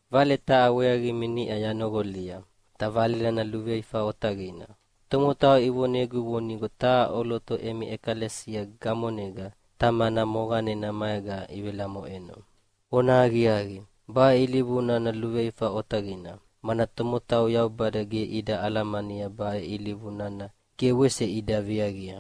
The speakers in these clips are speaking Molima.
Vale taha weaqimi niʼa yanoqolia, ta vale nana luveifa otaqina. Tomotau ivonegu vonigo taha ʼoloto emi ʼekalesia gamonega tamana moqanena maega ivelamoʼeno. Vonahaqiaqi, baʼe ilivu nana luveifa otaqina, mana tomotau Yaubada ge ida alamania baʼe ilivu nana ge wese ida viaqia.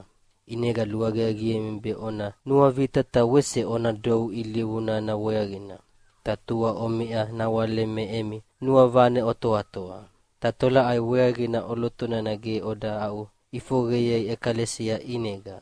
ʼInega luaqiaqiemi be ona nuavita ta wese ona dou ilivu nana weaqina, ta tua omiʼa nawale me emi nuavane otoatoa. Ta tolaʼai weaqina ʼoloto nana ge oda aʼuʼifoqeyei ʼekalesia ʼinega?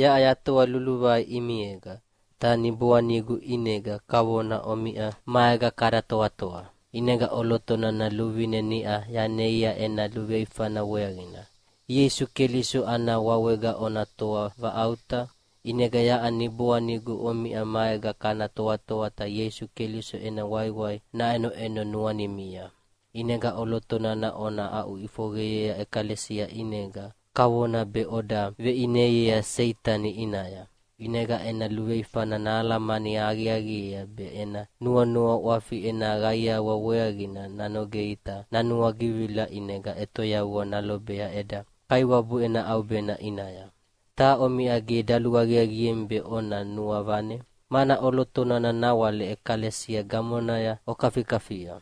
Yaʼa yatoa luluvai ʼimiega, ta niboanigu ʼinega kavona omiʼa maega kada toatoa. ʼInega ʼoloto nana luvine niʼa yaneia ena luveifana weaqina. Ieisu Keliso ana wawega ona toa vaʼauta, ʼinega yaʼa niboanigu omiʼa maega kana toatoa ta Ieisu Keliso ena waiwai naʼenoʼeno nuanimia. ʼInega ʼoloto nana ona aʼuʼifoqeyea ʼekalesia ʼinega kavona be oda veʼineiea Seitani ʼinaya. ʼInega ena luveifana nahalamani aqiaqiea be ena nuanua ʼwafi ena qaiawa weaqina nanogea ta nanuagivila ʼinega ʼetoyavua nalobea eda Kaiwabu ena ʼaubena ʼinaya. Ta omiʼa ge daluaqiaqiemi be ona nuavane, mana ʼoloto nana nawale ʼekalesia gamonaya okafikafia.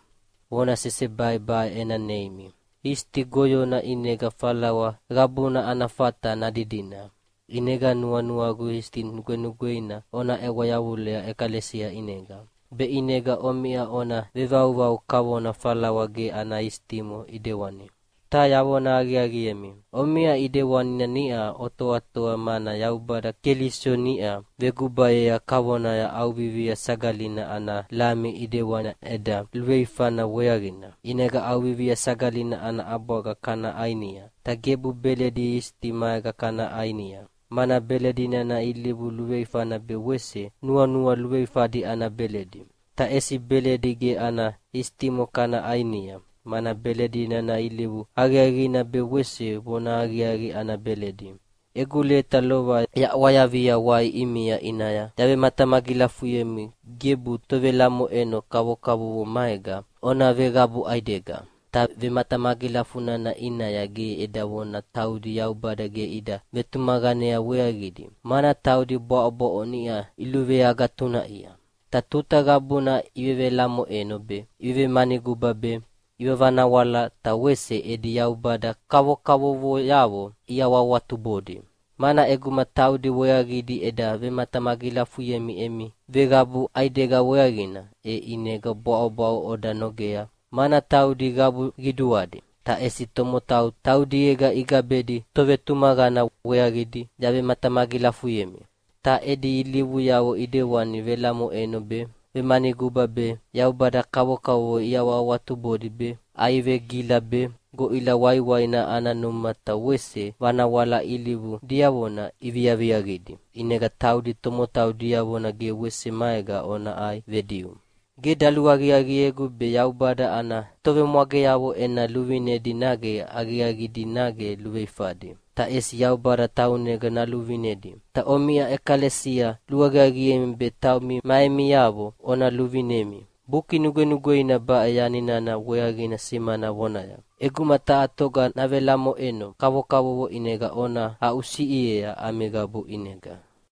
Vona sesebai baʼe ena neimi: Isiti goyona ʼinega falawa qabuna ana fata nadidina. ʼInega nuanuagu isiti nugwenugweina ona ʼewa yavulea ʼekalesia ʼinega, be ʼinega omiʼa ona vevauvau kavona falawa ge ana isitimo ʼidewani. Ta yavona aqiaqiemi, omiʼa ʼidewanina niʼa otoatoa, mana Yaubada Keliso niʼa vegubayea kavona ʼAuvivia Sagalina ana lami ʼidewani eda luveifana weaqina. ʼInega ʼAuvivia Sagalina ana ʼabwaga kana ʼainia, ta gebu beledi isiti maega kana ʼainia, mana belidi nana ilivu luveifana be wese nuanua luveifadi ana beledi. Ta ʼesi beledi ge ana isitimo kana ʼainia, mana beledi nana ilivu aqiaqina be wese vonahaqiaqi ana beledi. Egu leta lova yaʼwayavia wai ʼimia ʼinaya yavematamagilafuyemi gebu tovelamoʼeno kavokavovo maega ona veqabu ʼaidega. Ta vematamagilafu nana ʼinaya ge eda vona taudi Yaubada ge ida vetumaqanea weaqidi, mana taudi bwaʼobwaʼo niʼa iluveagatunaʼia, ta tuta qabuna ivevelamoʼeno be, ivevemanuguba be, ivanavanawala ta wese edi yaubada kavokavovoyavo iawahawatubodi. Mana ʼeguma taudi weaqidi eda vematamagilafuyemi emi veqabu ʼaidega weaqina, e ʼinega bwaʼobwaʼo oda nogea, mana taudi qabu qiduadi, ta ʼesi tomotau taudiega igabedi tovetumaqana weaqidi yavematamagilafuyemi. Ta edi ilivuyavo ʼidewani velamoʼeno be, vemanuguba be, yaubada kavokavovo iawahawatubodi be, ʼaivegila be, goʼila waiwaina ana numa ta wese vanawala ilivu diavona iviaviaqidi. ʼInega taudi tomotau diavona ge wese maega ona ʼai vediu! Ge daluaqiaqiegu be Yaubada ana tovemwageavo ena luvinedi nage aqiaqidi nage luveifadi. Ta ʼesi Yaubada taunega naluvinedi. Ta omiʼa ʼekalesia luaqiaqiemi be taumi ma emiavo ona luvinemi. Buki Nugwenugweina baʼe yani nana weaqina simana vonaya, “ʼEguma taha toga navelamoʼeno kavokavovo ʼinega ona aʼusiʼiea ami qabu ʼinega.”